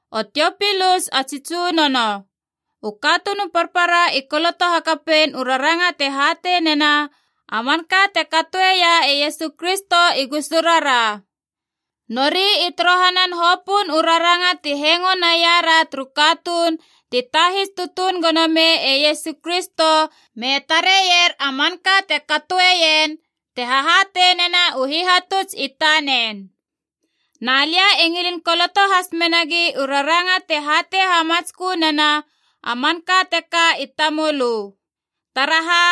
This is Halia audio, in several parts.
O Tiopilus a tsi tsunono, u katuun u parpara i koloto hakapein u raranga te hatei nena a manka te katoeia e Iesu Kristo i gusurara. Nori i torohanan hopöön u raranga ti hengo naiara turu katuun ti tahis tutuun gono mei e Iesu Kristo me tareier a manka te katoeien te hahatei nena u hihatuts i tanen. Na lia e ngilin koloto has menagi u raranga te hatei hamatskö nena a manka teka i tamölö. Taraha?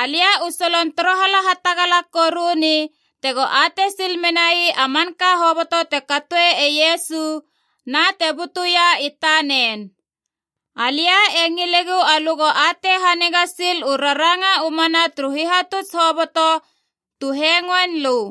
Alia u solon torohala hatagala koruni tego atei sil menai a manka hoboto te katoe e Iesu na te butuia i tanen. Alia e ngilegu alö go atei haniga sil u raranga u mana turu hihatuts hoboto tu hengoein lö.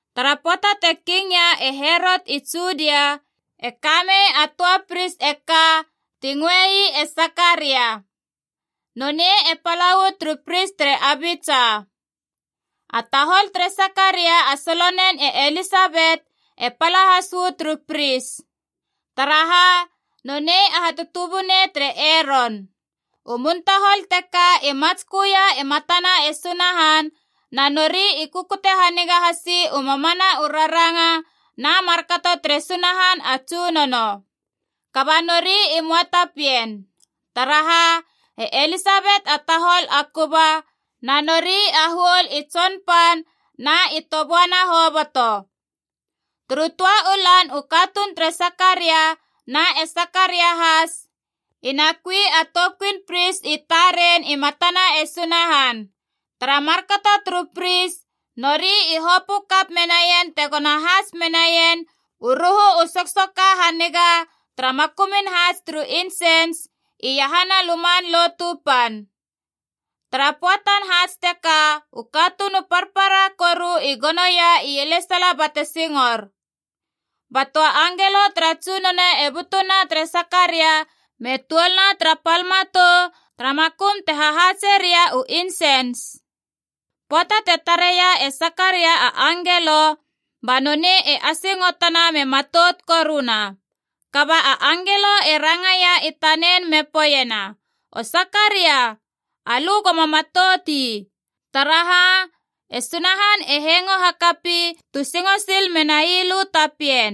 Tara pöata te kingia e Herot i Judia, e kamei a töa pris e ka ti ngöei e Sakaria. Nonei e pala uu turu pris tere Abitsa. A tahol tere Sakaria a solonen e Elisabet e pala has uu turu pris. Taraha? Nonei a hatutubunei tere Eron. U muntahol teka i matsköia i matana e Sunahan, na nori i kukute haniga hasi u mamana u raranga na markato tere Sunahan a Tsunono. Kaba nori i möa ta pien. Taraha? E Elisabet a tahol a kuba, na nori a huol i tsonpan na i toböana hoboto. Turu töa u lan u katuun tere Sakaria, na e Sakaria has, i na kui a toukuin pris i taren i matana e Sunahan. Tara markato turu pris nori i hopö kap menaien tegona hats menaien u ruhu u soksoka haniga tara makumun haats turu insens iahana Luman Lotu Pan. Tara pöatan haats teka u katuun u parpara koru i gonoia ielesala bate singor. Ba töa angelo tara Tsunono e butuna tere Sakaria me tuolna tara pal matou tara makum te hahaatse ria u insens. Pöata te tareia e Sakaria a angelo, ba nonei e asingotona me matout koruna. Kaba a angelo e rangaia i tanen me poeiena, “O Sakaria, alö goma matout ii. Taraha? E Sunahan e hengo hakapi tu singo sil menai lö ta pien.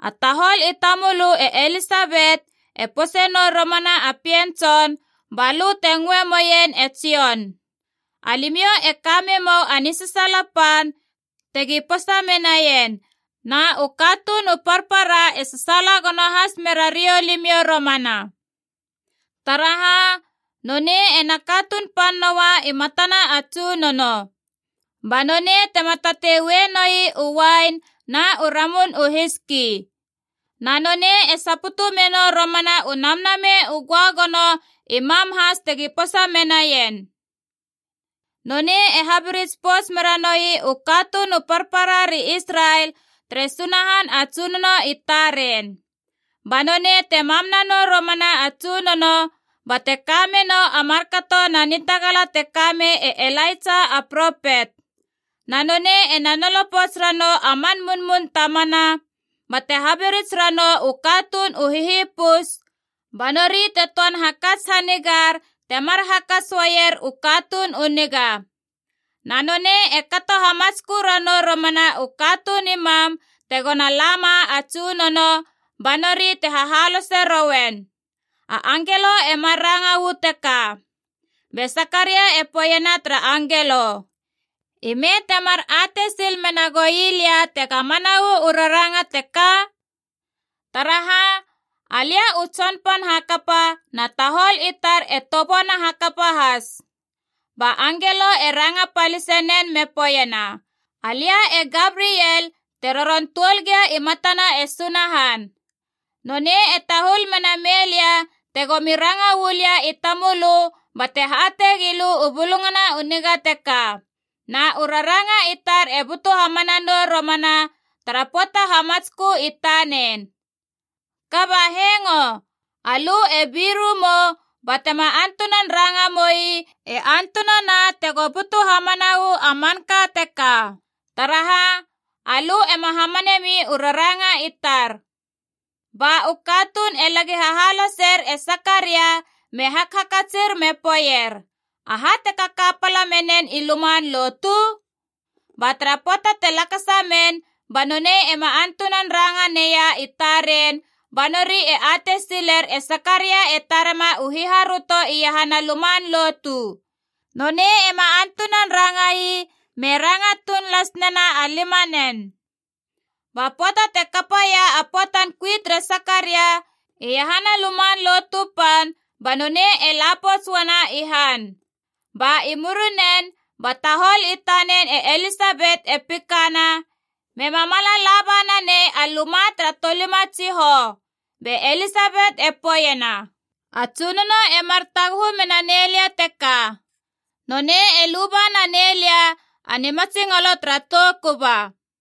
A tahol i tamölö e Elisabet e pose nou romana a pien tson, balö te ngöe moeien e Jon. Alimiou e ka memou a nisasaala pan tegi posa menaien, na u katuun u parpara e sasaala gono has merariou limiou romana. Taraha? Nonei ena katuun pan noa i matana a Tsunono. Ba nonei tema tatei ue noi u uain na u ramun u hiski. Na nonei e saputu menou romana u Namnamei u Göagono i mam has tegi posa menaien! Nonei e habirits pouts mera noi u katuun u parpara ri Israel tere Sunahan a Tsunono i taren. Ba nonei te mam nanou romana a Tsunono bate ka menou a markato na nitagala te ka mei e Ilaitsa a propet. Na nonei ena nolo pouts ranou a man munmun tamana, bate habirits ranou u katuun u hihipus ba nori te töan hakats hanigar temar hakats uaier u katuun u niga. Na nonei e kato hamatskö ranou romana u katuun i mam tegona lama a Tsunono, ba nori te hahalose rouen.” A angelo e mar ranga uu teka. Be Sakaria e poeiena tara angelo, “I me temar atei sil mena goi lia tega mana uu raranga teka? Taraha, alia u tsonpan hakapa na tahol i tar e toböana hakapa has.” Ba angelo e ranga palise nen me poeiena, “Alia e Gabriel te roron tuol gia i matana e Sunahan. Nonei e tahul mena mei lia tegomi ranga uu lia i tamölö bate hatei gilö u bulungana u niga teka. Na u raranga i tar e butu hamana nou romana tara pöata hamatskö i tanen. Kaba hengo! Alö e biru mou batema antunan ranga moui e antunana tego butu hamana uu a manka teka! Taraha? Alö ema hamanemi u raranga i tar!” Ba u katuun e lagi hahaloser e Sakaria, me hakhakatsir me poeier, “Aha te kaka pala menen i luman lotu?” Ba tara pöata te lakasa men ba nonei ema antunan ranga neia i taren, ba nori e atei siler e Sakaria e tarema u hiharöto iahana luman lotu. Nonei ema antunan ranga ii me ranga tuun las nena a limanen. Ba pöata te kapaia a pöatan kui tere Sakaria iahana Luman Lotu Pan, ba nonei e la pouts uana i han. Ba i murinen ba tahol i tanen e Elisabet e pikana, mema mala laba nanei a luma tara tolima tsihou. Be Elisabet e poeiena, “A Tsunono emar taguhu mena nei lia teka. Nonei e luba naneilia a nimatsingolo tara tou kuba.”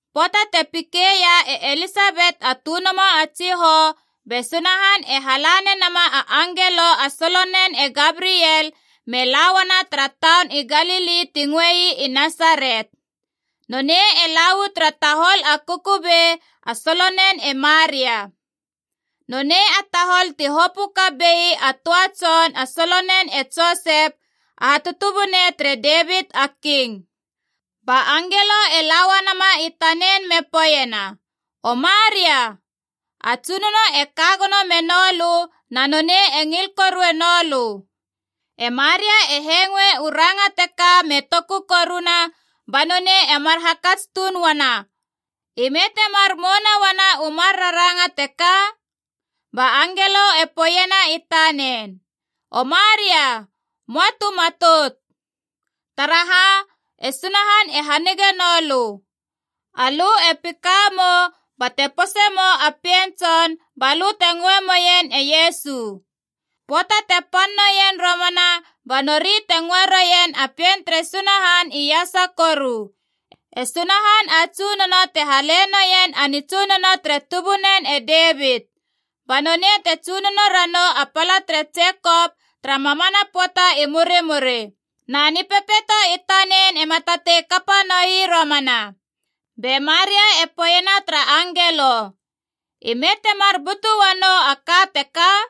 Pöata te pikeia e Elisabet a tönomo a tsihou, be Sunahan e hala nenama a angelo a solonen e Gabriel me la uana tara taun i Galili ti ngöei i Nasaret. Nonei e la uu tara tahol a kukubei a solonen e Maria. Nonei a tahol ti hopö kap bei a töa tson a solonen e Josep, a hatutubunei tere Devit a King. Ba angelo e la uanama i tanen me poeiena, “O Maria, a Tsunono e ka gono meno lö na nonei e ngil korue noulö.” E Maria e hengoe u ranga teka me toku koruna, ba nonei emar hakats tuun uana, “I me temar mouna uana u mar raranga teka?” Ba angelo e poeiena i tanen, “O Maria, moa tu matout. Taraha? E Sunahan e hanige noulö. Alö e pika mou bate posei mou a pien tson, balö te ngöe moien e Iesu. Pöata te pan noien romana ba nori te ngöe roien a Pien tere Sunahan iasa Koru. E Sunahan a Tsunono te hale noien a nitsunono tere tubunen e Devit. Ba nonei te tsunono ranou a pala tere Jekop tara mamana pöata i murimuri. Na nipepeito i tanen ema tatei kapa noi romana.” Be Maria e poeiena tara angelo, “Ime temar butu uanou a ka teka?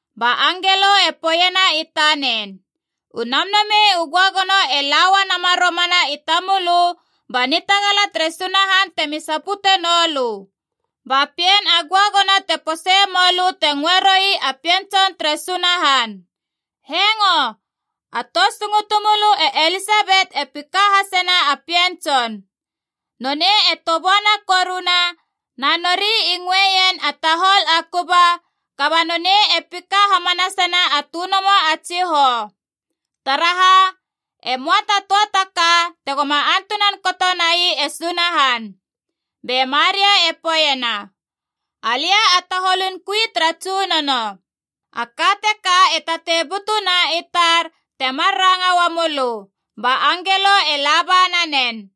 Ba angelo e poeiena i tanen, “U Namnamei u Göagono e la uanama romana i tamölö ba nitagala tere Sunahan temi sapute noulö. Ba pien a göagono te pose moulö te ngöe roui a Pien Tson tere Sunahan. Hengo! A tou sungutu mölö e Elisabet e pika hasena a pien tson! Nonei e toböana koruna na nori i ngöeien a tahol a kuba, kaba nonei e pika hamanasena a tönomo a tsihou! Taraha? E möa ta töa ta ka te goma antunan kato nai e Sunahan.” Be Maria e poeiena, “Alia a taholun kui tara Tsunono. A ka teka e tatei butuna i tar temar ranga uamula lö.” Ba angelo e laba nanen.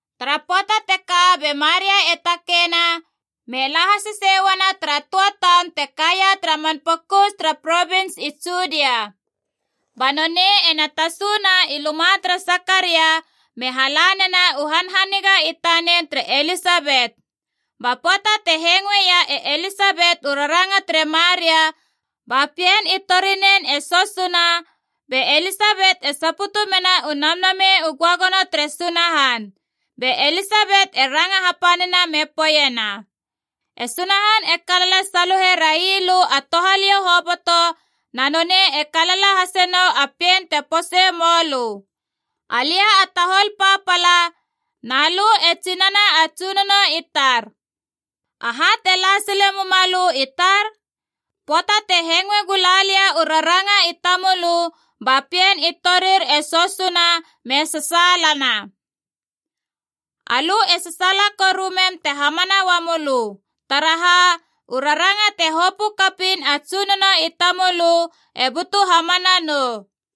Tara pöata teka be Maria e takeina me la hasesei uana tara töa taun te kaia tara man pokus tara provins i Judia. Ba nonei ena tasuna i luma tere Sakaria me hala nena u hanhaniga i tanen tere Elisabet. Ba pöata te hengoeia e Elisabet u raranga tere Maria, ba pien i torinen e sosuna, be Elisabet e saputu mena u Namnamei u Göagono tere Sunahan. Be Elisabet e ranga hapanina me poeiena, “E Sunahan e kalala saluhe railö a touhaliou hoboto, na nonei e kalala hase nou a pien te pose moulö. Alia a tahol papala, na lö e tsinana a Tsunono i tar. Aha te la sile mumalö i tar? Pöata te hengoe gula lia u raranga i tamölö, ba pien i torir e sosuna me sasaalana. Alö e sasaala koru mem te hamana uamölö. Taraha? U raranga te hopö kapiin a Tsunono i tamölö e butu hamana nou.”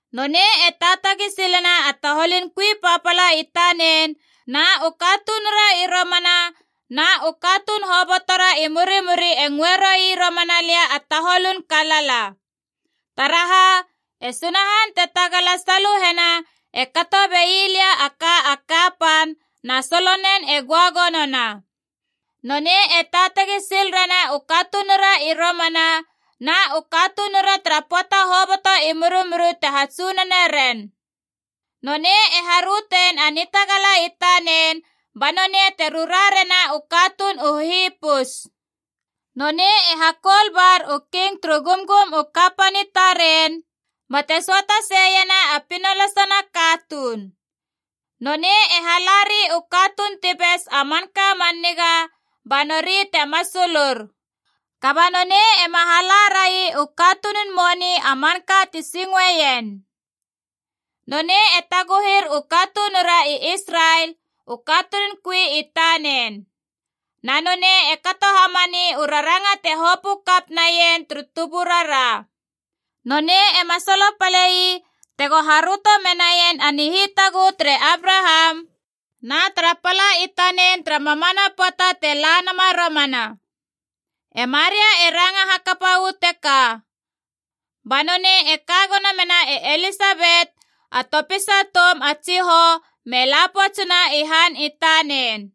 Nonei e taatagi silena a taholun kui papala i tanen, na u katunura i romana na u katuun hobotora i murimuri e ngöe roui romana lia a taholun kalala. Taraha? E Sunahan te Tagala Saluhena e kato bei lia a ka a kapan, na solonen e göagonona. Nonei e taatagi sil rena u katunura i romana na u katunura tara pöata hoboto i murimuri te hatsunone ren. Nonei e harötein a nitagala i tanen, ba nonei te rura rena u katuun u hihipus. Nonei e hakoul bar u king turu gumgum u kapan i taren, bate söata seiena a pinolasana katuun. Nonei e halari u katuun ti bes a manka man niga, ba nori te masulur. Kaba nonei ema hala rai u katunun moni a manka ti singoeien. Nonei e taguhir u katunura i Israel, u katunun kui i tanen. Na nonei e kato hamani u raranga te hopö kap naien turu tuburara. Nonei ema solopale ii tego haröto menaien a nihitaguhu tere Abraham na tara pala i tanen tara mamana pöata te la nama romana.” E Maria e ranga hakapa uu teka. Ba nonei e ka gono mena e Elisabet a topisa toum a tsihou, me la poutsuna i han i tanen.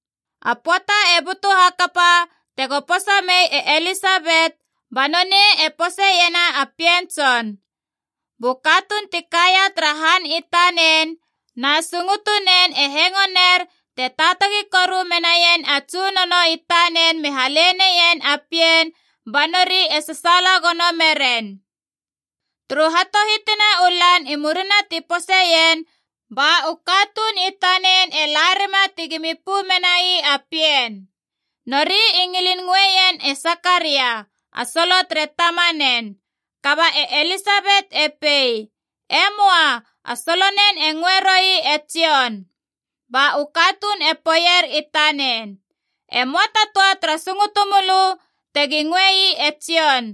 A pöata e butu hakapa tego posa mei e Elisabet, ba nonei e poseiena a pien tson. Bu katuun ti kaia tara han i tanen na sungutunen e hengoner te taatagi koru menaien a Tsunono i tanen me hale neien a pien, ba nori e sasaala gono meren. Turu hatohitina u lan i murina ti poseien, ba u katuun i tanen e la rima tegimi pö menai a pien. Nori i ngilin ngöeien e Sakaria, a solo tere tamanen. Kaba e Elisabet e pei, “E möa, a solonen e ngöe roui e Jon!” Ba u katuun e poeier i tanen, “E möa ta töa tara sungutu mölö tegi ngöei e Jon!”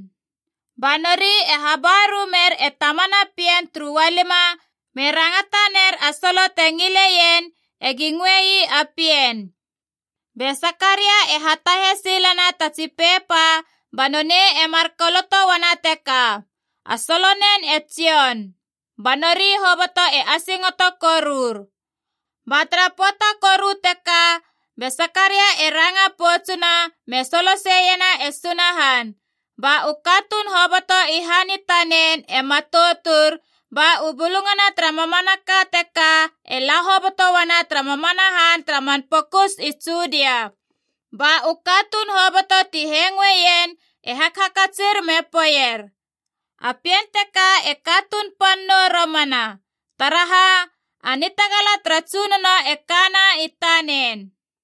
Ba nori e habaru mer e tamana pien turu ualima me rangata ner a solo te ngileien egi ngöei a pien. Be Sakaria e hatahe silena ta tsi pepa ba nonei e mar koloto uana teka: “A solonen e Jon.” Ba nori hoboto e asingoto korur. Ba tara pöata koru teka be Sakaria e ranga poutsuna, me soloseiena e Sunahan. Ba u katuun hoboto i han i tanen e matoutur, ba u bulungana tara mamanaka teka e la hoboto uana tara mamana han tara man pokus i Judia. Ba u katuun hoboto ti hengoeien e hakhakatsir me poeier, “A pien teka e katuun pan nou romana! Taraha? A nitagala tara Tsunono e kana i tanen.”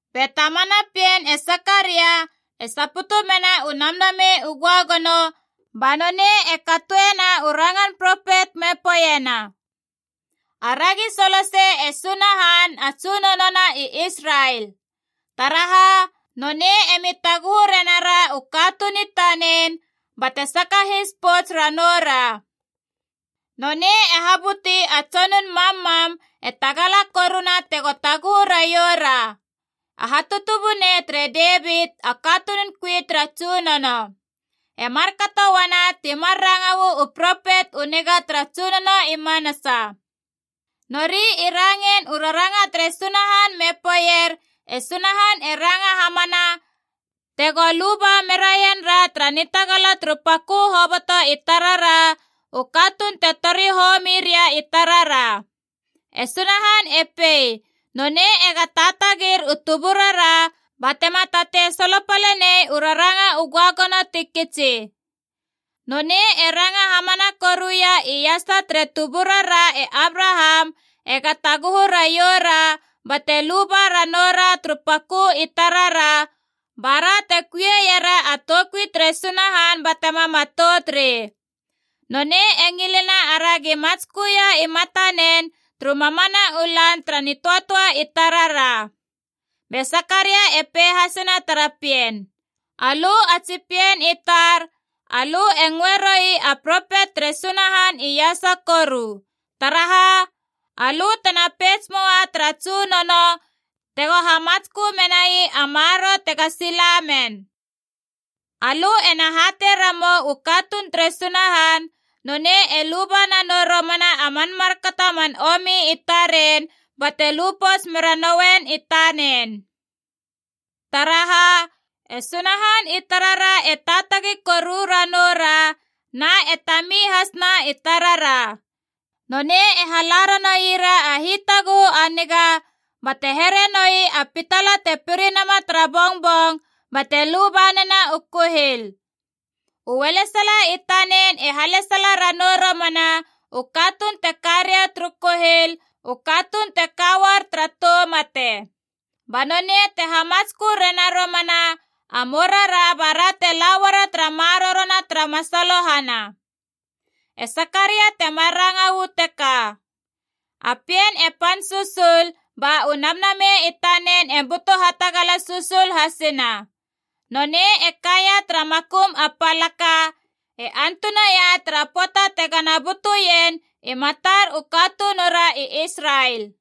Be tamana pien, e Sakaria, e saputu mena u Namnamei u Göagono, ba nonei e katoena u rangan propet me poeiena: “Aragi solosei e Sunahan a Tsunono na i Israel! Taraha? Nonei emi taguhu renara u katuun i tanen, bate sakahis pouts ranoura. Nonei e habuti a tsonun mammam a tagala koru tego taguhu raioura, a hatutubunei tere Devit, a katunun kui tara Tsunono. E markato uana ti mar ranga uu propet u niga tara Tsunono i manasa. Nori i rangein u raranga tere Sunahan me poeier e Sunahan e ranga hamana tego luba meraienra tara nitagala turu pakö hoboto i tarara, u katuun te tori homi ria i tarara. E Sunahan e pei nonei ega taatagir u tuburara batema tatei solopale nei u raranga u göagono ti kitsi. Nonei e ranga hamana koruia iasa tere tuburara e Abraham ega taguhu raioura bate luba ranoura turu pakö i tarara, bara te kuiera a toukui tere Sunahan batema matout rei. Nonei e ngilena aragi matsköia i matanen turu mamana u lan tara nitöatöa i tarara.” Be Sakaria e pei hasena tara pien, “Alö a tsi pien i tar, alö e ngöe roui a propet tere Sunahan iasa Koru. Taraha? Alö tena peits moa tara Tsunono tego hamatskö menai a maroro tega sila men. Alö ena hatei ramou u katuun tere Sunahan nonei e luba nanou romana a man markato a man omi i taren bate lu pouts mera nouien i tanen. Taraha? E Sunahan i tarara e taatagi koru ranoura na e tami has na i tarara. Nonei e hala ranoira a hitaguhu a niga bate here noi a pitala te piri nama tara bongbong bate luba nena u kuhil. U ualesala i tanen e halesala ranou romana u katuun te ka ria turu kuhil, u katuun te ka uar tara tou mate. Ba nonei te hamatskö rena romana a mourara bara te lauara tara marorona tara masalohana.” E Sakaria temar ranga uu teka. A pien e pan susul ba u namnamei i tanen e butu hatagala susul hasina. Nonei e kaia tara makum a palaka, e antunaia tara pöata tega na butuien i matar u katunura i Israel.